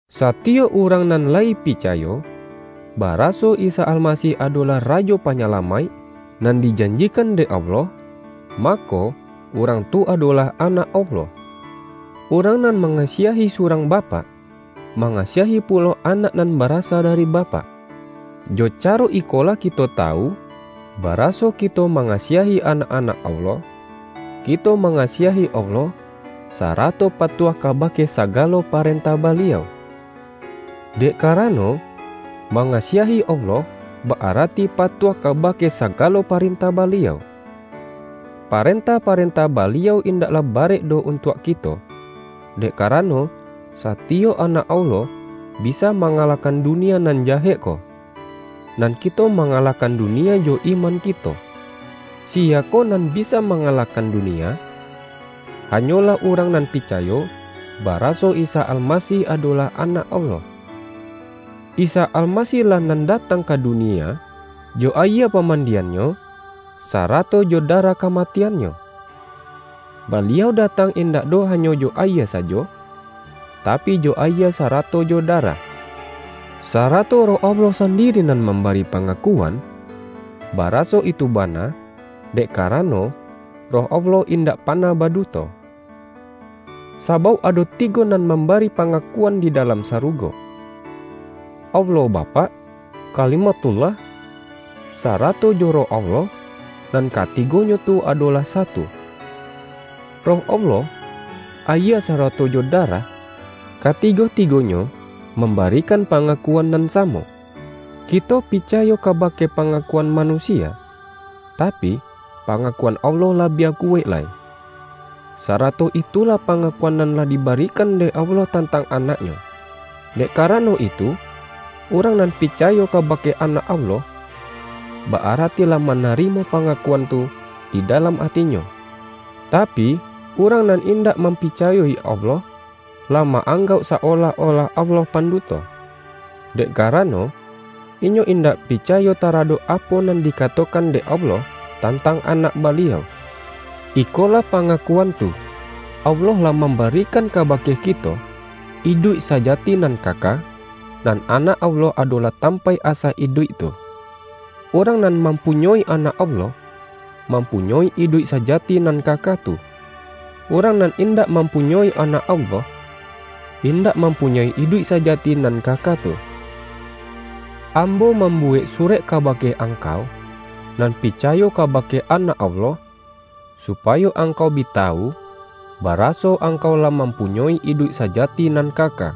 Satiyok urang nan layi picayo, ba-raso Isa Almasih adolah Rajo Pa-nyalamaik nan dijanjikan dek Allah, mako, urang tu adolah anak Allah. Urang nan mangasiahi surang bapak, mangasiahi pulo anak nan barasa da-ri bapak. Jo caro ikolah kito tawu, baraso kito mangasiahi anak-anak Allah: Kito mangasiahi Allah, sarato patuah kabake sagalo parentah Ba-liau. Dek karano, mangasiahi Allah ba-arati patuah kabake sagalo paren-tah Baliau. Parentah-parentah Baliau indaklah barek doh untuak kito, dek karano, satiyok anak Allah bisa mangalahkan dunia nan jahek ko. Nan kito mangalahkan dunia jo iman kito. Siyakoh nan bisa mangalahkan du-nia? Hanyolah urang nan picayo, ba-raso Isa Almasih adolah Anak Allah. Isa Almasih-lah nan datang ka du-nia jo ayie pamandian-Nyo, sarato jo darah kamatian-Nyo. Baliau datang indak doh hanyo jo ayie sajo, tapi, jo ayie sarato jo darah. Sarato Roh Allah sandiri nan mambari pangakuan, ba-raso itu bana, dek karano, Roh Allah indak panah baduto. Sabauk ado ti-go nan mambari pangakuan di dalam sarugo: Allah Bapak, Kalimathullah, sarato jo Roh Allah; nan Katigonyo tu adolah Satu. Roh Allah, ayie sarato jo darah — katigo-tigonyo mambari-kan pangakuan nan samo. Kito pica-yo kabake pangakuan manusia, tapi, pangakuan Allah labiah kuwaik lai. Sarato itulah pangakuan nan lah di-barikan dek Allah tantang Anak-Nyo. Dek karano itu, urang nan picayo kabake Anak Allah, ba-arati lah ma-narimo pangakuan tu di dalam atinyo; tapi, urang nan indak mampicayo-i Allah, lah ma-anggauk sa-olah-olah Allah panduto, dek karano, inyo in-dak picayo taradok apo nan dikato-kan dek Allah tantang Anak Baliau. Ikolah pangakuan tu: Allah lah mambarikan kabake kito iduik saja-ti nan kaka, nan Anak Allah adolah tampaik asa iduik tu. Urang nan mampunyoi Anak Allah, mampunyoi iduik sajati nan kaka tu; urang nan indak mampunyoi Anak Allah, indak mampunyoi iduik sajati nan kaka tu. Ambo mambuwek surek kaba-ke angkau nan picayo kabake Anak Allah, supayo angkau bi tawu, bara-so angkau lah mampunyoi iduik saja-ti nan kaka.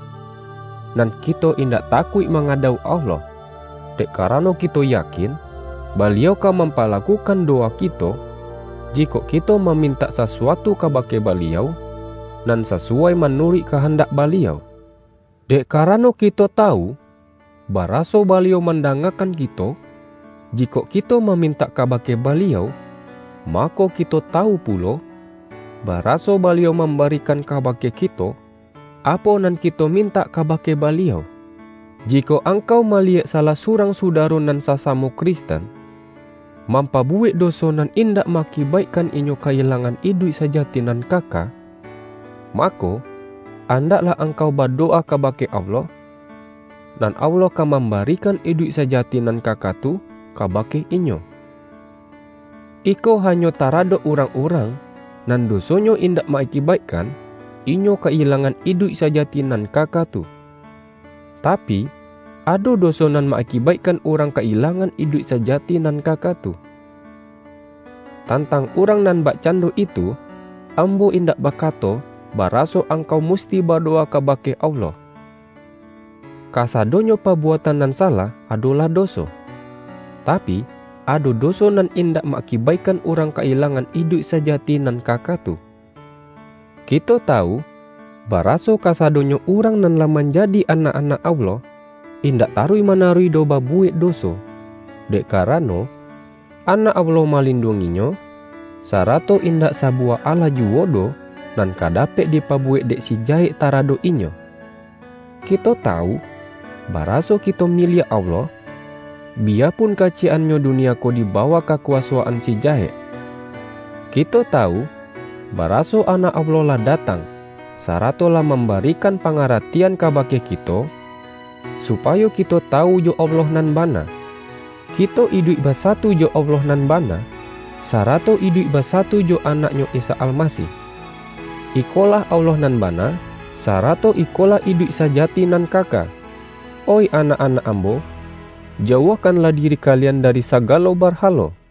Nan kito indak takuik mangadauk Allah, dek karano kito ya-kin, Baliau ka mampalakukan dowa kito, jikok kito mamintak sasuatu ka-bake Baliau, nan sasuwai manuruik kahandak Baliau. Dek karano kito tawu, baraso Baliau mandangakan ki-to, jikok kito mamintak kabake Ba-liau, mako, kito tawu pulo, baraso Baliau mambarikan kabake kito, apo nan kito mintak kabake Baliau. Jikok angkau maliyek salah su-rang sudaro nan sasamo Kristen, mampabuwek doso nan indak ma-akibaikkan inyo ka-ilangan iduik sa-jati nan kaka, mako, andaklah ang-kau badowa kabake Allah; nan Allah ka mambarikan iduik sajati nan ka-ka tu kabake inyo. Iko hanyo tara-dok urang-urang, nan dosonyo indak ma-akibaikkan inyo ka-ilangan iduik sajati nan kaka tu. Tapi, ado doso nan ma-akibaikkan urang ka-ilang-an iduik sajati nan kaka tu. Tantang urang nan bakcando itu, ambo indak bakato baraso angkau musti badowa kabake Allah. Kasadonyo pabuatan nan salah adolah doso, tapi, ado doso nan indak ma-akibaikkan urang ka-ilangan iduik sajati nan kaka tu. Kito tawu, baraso kasadonyo urang nan lah manjadi anak-anak Allah, indak taruih manaruih doh babuwek doso, dek karano, Anak Allah malinduang-inyo, sarato in-dak sabuwah alah juwo doh nan ka dapek dipabuwek dek si Jahek tara-dok inyo. Kito tawu, baraso kito miliak Allah, biyapun kaciyek-annyo dunia ko di bawah kakuwasoan si Jahek. Kito tawu, baraso Anak Allah lah datang, sarato lah mambarikan pa-ngaratian kabake kito, supayo kito ta-wu jo Allah nan bana. Kito iduik ba-satu jo Allah nan bana, sarato iduik basatu jo Anak-Nyo Isa Almasih. Iko-lah Allah nan bana, sarato ikolah iduik sajati nan kaka. Oih anak-anak ambo, jauahkan-lah diri kalian dari sagalo barhalo!